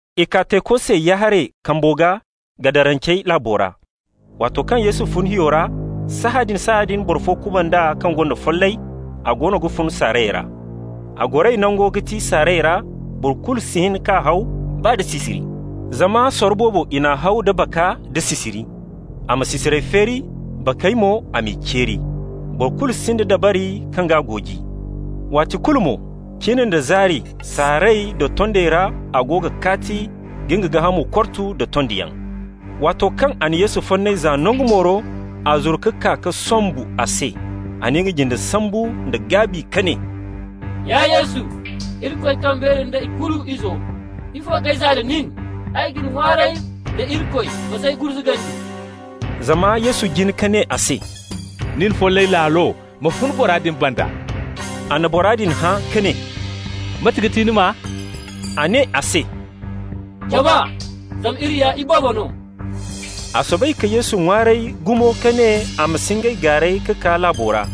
I kaa teeko se ya-haray kambo gaa, Gadarancey laabo ra. Waato kaŋ Yesu fun hiyo ra, sahãadin-sahãadin boro fo kuband'a kaŋ gonda follay, a goono ga fun saarayey ra. A goray nango ga ti saarayey ra, boro kulu si hin k'a haw, baa da sisiri. Zama sorro boobo i n'a haw da baka da sisiri. A ma sisirey feeri, bakey mo a m'i ceeri. Boro kulu sinda dabari kaŋ g'a gooji. Waati kulu mo, cin da zaari, saarayey da tondey ra a go ga kaati ka nga gaahamo kortu nda tondiyaŋ. Waato kaŋ a na Yesu fonnay za nangu mooro, a zuru ka kaa ka sombu a se. A na nga jinde sambu nda gaabi ka ne: «Ya Yesu, Irikoy kaŋ beeri da ikulu Izo, ifo k'ay zaa da nin? Ay ga ni ŋwaaray da Irikoy, ma s'ay gurzugandi.» Zama Yesu jin ka ne a se: «Nin follay laalo, ma fun bora din banda.» A na bora din hã ka ne: «Mate ga ti ni maa?» A ne a se: «Jama, zama iri ya iboobo no.» A soobay ka Yesu ŋwaaray gumo ka ne a ma si ngey gaaray ka kaa laabo ra.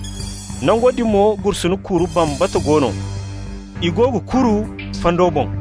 Nango din mo gursuna kuru bambata go no, i go ga kuru fando boŋ.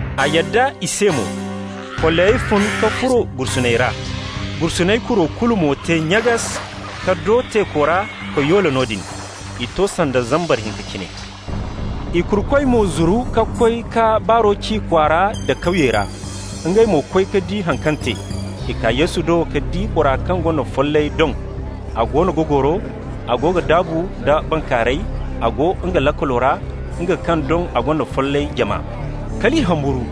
A yadda i se mo. Follayey fun ka furo gursuney ra. Gursuney kuro kulu mo te nyagas ka do teeko ra ka yoole noodin. I to sanda zambar hinka cine. I kurukoy mo zuru ka koy ka baaro ci kwaara nda kawyey ra. Ngey mo koy ka di haŋ kaŋ te. I kaa Yesu do ka di bora kaŋ gonda follayey doŋ, a goono ga goro, a go ga daabu nda bankaaray, a go nga laakalo ra, nga kaŋ doŋ a gonda follay jama. Kal i humburu.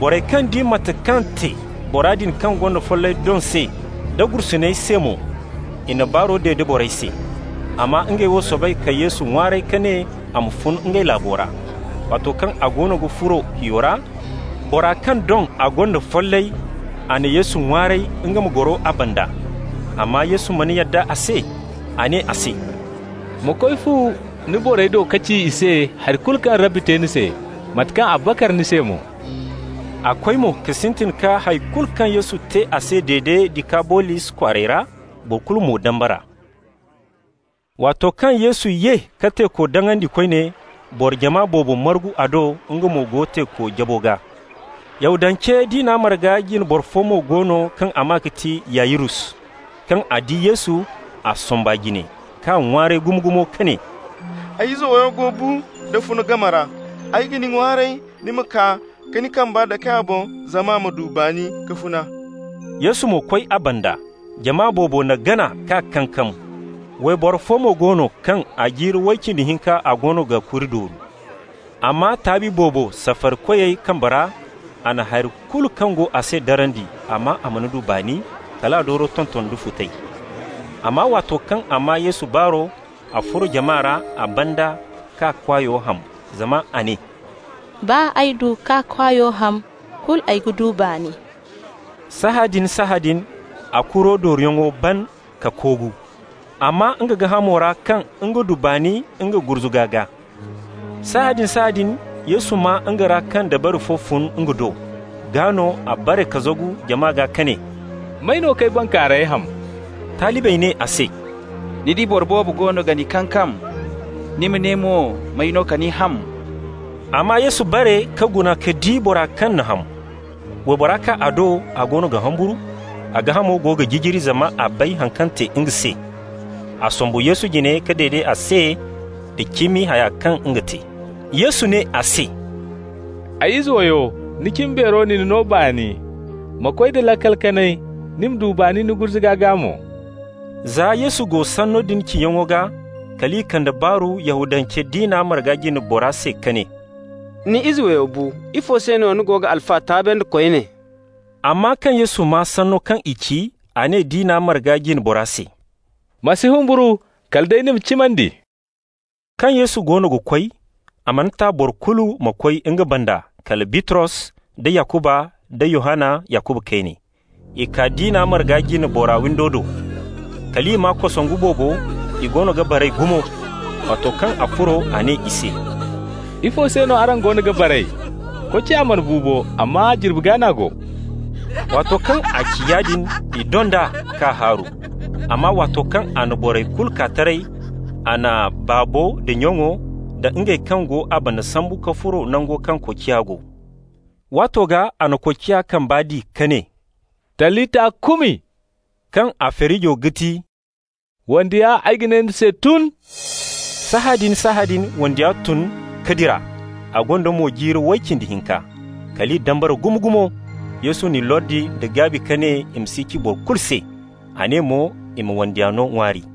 Borey kaŋ di mate kaŋ te bora din kaŋ gonda follay doŋ se, da gursuney se mo, i na baaro dede borey se. Amma ngey wo soobay ka Yesu ŋwaaray ka ne a ma fun ngey laabo ra. Waato kaŋ a goono ga furo hiyo ra, bora kaŋ doŋ a gonda follay, a na Yesu ŋwaaray nga ma goro a banda. Amma Yesu mana yadda a se. A ne a se: «Ma koy fu ni borey do ka ci i se hari kulu kaŋ Rabbi te ni se, mate kaŋ a bakar ni se mo.» A koy mo ka sintin ka hay kulu kaŋ Yesu te a se dede Dikabolis kwaarey ra. Boro kulu mo dambara. Waato kaŋ Yesu ye ka teeko daŋandi koyne, boro jama boobo margu a do, nga mo go teeko jabo gaa. Yahudance diina marga jine boro fo mo go no kaŋ a maa ga ti Yayirus. Kaŋ a di Yesu, a somb'a jine k'a ŋwaaray gumo-gumo ka ne: «Ay ize wandiyo go bu da funa game ra. Ay ga ni ŋwaaray ni ma kaa ka ni kambey dake a boŋ, zama a ma du baani ka funa.» Yesu mo koy a banda. Jama boobo n'a gana k'a kankam. Wayboro fo mo go no kaŋ a jiiri way cindi hinka a goono ga kuri dooru. A maa taabi boobo safarikoyey kambey ra. A na hari kulu kaŋ go a se darandi, amma a mana du baani, kal a dooro tonton da futay. Amma waato kaŋ a maa Yesu baaro, a furo jama ra a banda k'a kwaayo ham. Zama a ne: «Baa ay du k'a kwaayo ham, kulu ay ga du baani.» Sahãadin-sahãadin a kuro dooruyaŋo ban ka koogu. A maa nga gaahamo ra kaŋ nga du baani nga gurzuga gaa. Sahãadin-sahãadin Yesu maa nga ra kaŋ dabari fo fun nga do. Gaa no a bare ka zagu jama gaa ka ne: «May no k'ay bankaaray ham?» Talibey ne a se: «Ni di boro boobo goono ga ni kankam, ni ma ne mo may no ka ni ham?» Amma Yesu bare ka guna ka di bora kaŋ n'a ham. Waybora kaa a do, a goono ga humburu, a gaahamo go ga jijiri, zama a bay haŋ kaŋ te nga se. A sombu Yesu jine ka dede a se da cimi haya kaŋ nga te. Yesu ne a se: «Ay ize wayo, ni cimbeero na ni no baani. Ma koy da laakal kanay, ni ma du baani ni gurzuga gaa mo.» Za Yesu go sanno din ciyaŋo gaa, kal i kande baaru Yahudance diina marga jine bora se ka ne: «Ni izo wayo bu. Ifo se ni ga Alfa taabandi koyne?» Amma kaŋ Yesu maa sanno kaŋ i ci, a ne diina marga jine bora se: «Ma si humburu, kala day ni ma cimandi.» Kaŋ Yesu goono ga koy, a mana ta boro kulu ma koy nga banda kala Bitros da Yakuba nda Yohanna, Yakuba kayne. I kaa diina marga jine bora windo do. Kal i maa kosongu boobo, i goono ga baray gumo. Waato kaŋ a furo, a ne i se: «Ifo se no araŋ goono ga baray? Koociya mana bu bo, amma jirbi gaa n'a go.» Waato kaŋ a ci yaadin, i dond'a k'a haaru. Amma waato kaŋ a na borey kulu kaa taray, a na baabo da nyaŋo da ngey kaŋ go nga banda sambu ka furo nango kaŋ koociya go. Waato gaa a na koociya kamba di ka ne: «Talita kumi!» (kaŋ a feerijo ga ti: «Wandiya, ay ga ne ni se, tun!») Sahãadin-sahãadin wandiya tun ka dira. A gonda mo jiiri way cindi hinka. Kal i dambara gumo-gumo. Yesu n'i lordi nda gaabi ka ne i ma si ci boro kulu se. A ne mo i ma wandiya no ŋwaari.